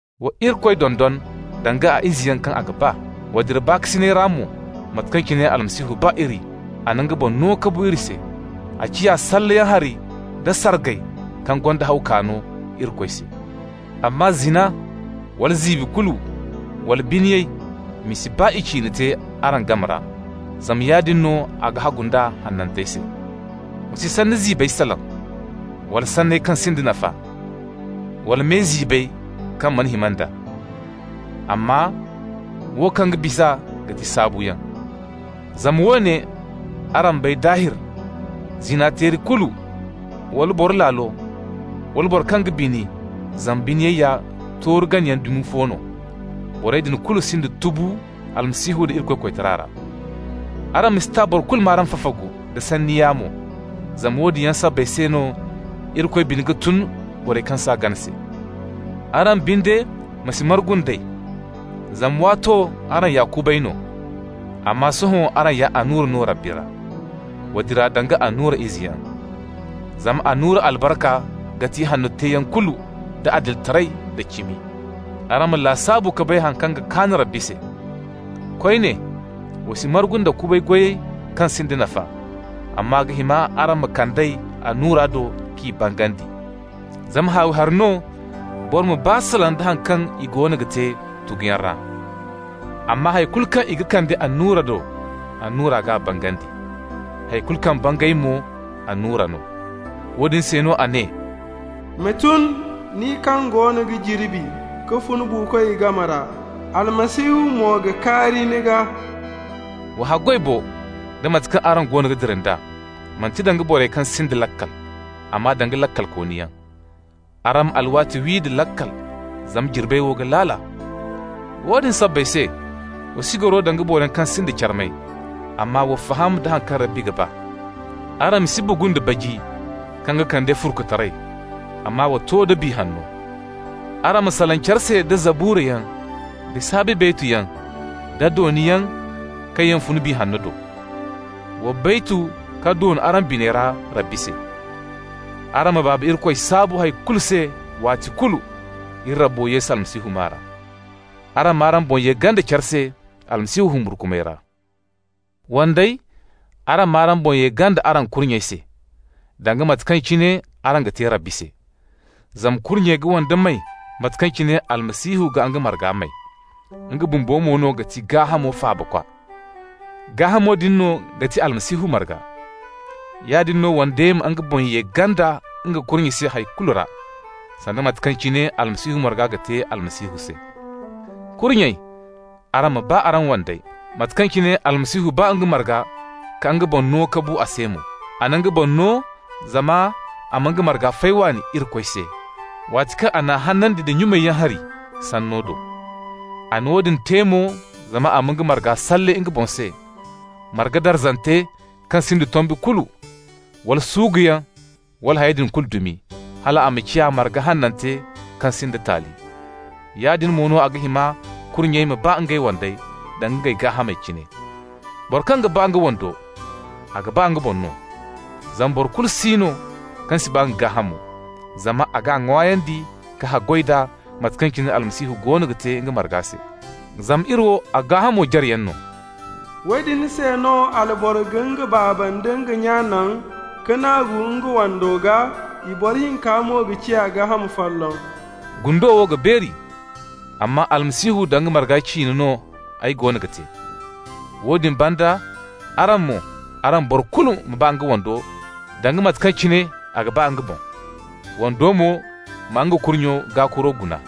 Wa Irikoy dondon danga a izeyaŋ kaŋ a ga ba. Wa dira baakasinay ra mo, mate kaŋ cine Almasihu ba iri, a na nga boŋ no mo ka bu iri se. A ciya salleyaŋ hari nda sargay kaŋ gonda haw kaano Irikoy se. Amma zina, wala ziibi kulu, wala biniyay, i ma si baa i ciine te araŋ game ra, zama yaadin no a ga hagu nd'a hanantey se. Wa si sanni ziibey salaŋ, wala sanney kaŋ sinda nafa, wala me ziibey kaŋ mana hima nd'a. Amma wo kaŋ ga bis'a ga ti saabuyaŋ. Zama woone araŋ bay daahir: zina-teeri kulu, wala boro laalo, wala boro kaŋ ga bini (zama biniyay ya tooru ganayaŋ dumi fo no), borey din kulu sinda tubu Almasihu nda Irikoy koytara ra. Araŋ ma si ta boro kulu m'araŋ fafagu nda sanni yaamo, zama woodin yaŋ sabbay se no Irikoy bine ga tun borey kaŋ s'a gana se. Araŋ binde, ma si margu nd'ey, zama waato araŋ ya kubay no, amma sohõ araŋ ya annura no Rabbi ra. Wa dira danga annura izeyaŋ. Zama annura albarka ga ti ihanno teeyaŋ kulu da adilitaray da cimi. Araŋ ma lasaabu ka bay haŋ kaŋ ga kaan Rabbi se. Koyne, Wa si margu nda kubay goyey kaŋ sinda nafa, amma a ga hima araŋ ma kand'ey annura do k'i bangandi. Zama haawi hari no boro ma baa salaŋ da haŋ kaŋ i goono ga te tuguyaŋ ra. Amma hay kulu kaŋ i ga kande annura do, annura g'a bangandi. Hay kulu kaŋ bangay mo annura no. Woodin se no a ne: «Ma tun, nin kaŋ goono ga jirbi, ka fun buukoy game ra, Almasihu mo ga kaari ni gaa.» Wa haggoy bo, da mate kaŋ araŋ goono ga dira nd'a, manti danga borey kaŋ sinda laakal, amma danga laakalkooniyaŋ. Araŋ ma alwaati wi da laakal, zama jirbey wo ga laala. Woodin sabbay se, wa si goro danga boroyaŋ kaŋ sinda carmay, amma wa faham da haŋ kaŋ Rabbi ga ba. Araŋ ma si bugu nda baji, kaŋ ga kande furkutaray, amma wa to da Biya Hanno. Araŋ ma salaŋ care se da Zaburayaŋ da saabi baytuyaŋ da dooniyaŋ kaŋ yaŋ fun Biya Hanno do. Wa baytu ka doon araŋ biney ra Rabbi se. Araŋ ma Baaba Irikoy saabu hay kulu se waati kulu, iri Rabbo Yesu Almasihu maa ra. Araŋ m'araŋ boŋ ye ganda care se Almasihu humburkumay ra. Wandey, araŋ m'araŋ boŋ ye ganda araŋ kurnyey se, danga mate kaŋ cine araŋ ga te Rabbi se. Zama kurnye ga wande may mate kaŋ cine Almasihu ga nga marga may. Nga bumbo mo no ga ti gaahamo faabakwa. Gaahamo din no ga ti Almasihu marga. Yaadin no wande ma nga boŋ ye ganda nga kurnye se hay kulu ra, sanda mate kaŋ cine Almasihu marga ga te Almasihu se. Kurnyey, araŋ ma ba araŋ wandey, mate kaŋ cine Almasihu ba nga marga ka nga boŋ no ka bu a se mo. A na nga boŋ no zama a ma nga marga fay waani Irikoy se, waati kaŋ a n'a hanandi da nyumayaŋ hari Sanno do. A na woodin te mo zama a ma nga marga salle nga boŋ se, marga darzante kaŋ sinda tombi kulu, wala suuguyaŋ wala hayey din kulu dumi, hal a ma ciya marga hanante kaŋ sinda taali. Yaadin mo no a ga hima kurnyey ma ba ngey wandey danga ngey gaahamey cine. Boro kaŋ ga ba nga wando, a ga ba nga boŋ no. Zama boro kulu si no kaŋ si ba nga gaahamo, zama a g'a ŋwaayandi ka haggoy d'a mate kaŋ cine Almasihu goono ga te nga marga se, zama iri wo a gaahamo jareyaŋ no. «Woodin se no alboro ga nga baaba nda nga nya naŋ, ka naagu nga wando gaa, i boro hinka mo ga ciya gaaham folloŋ.» Gundo wo ga beeri, amma Almasihu nda nga marga ciine no ay goono ga te. Woodin banda araŋ mo, araŋ boro fo kulu ma ba nga wando danga mate kaŋ cine a ga ba nga boŋ. Wando mo ma nga kurnyo gaakuro guna.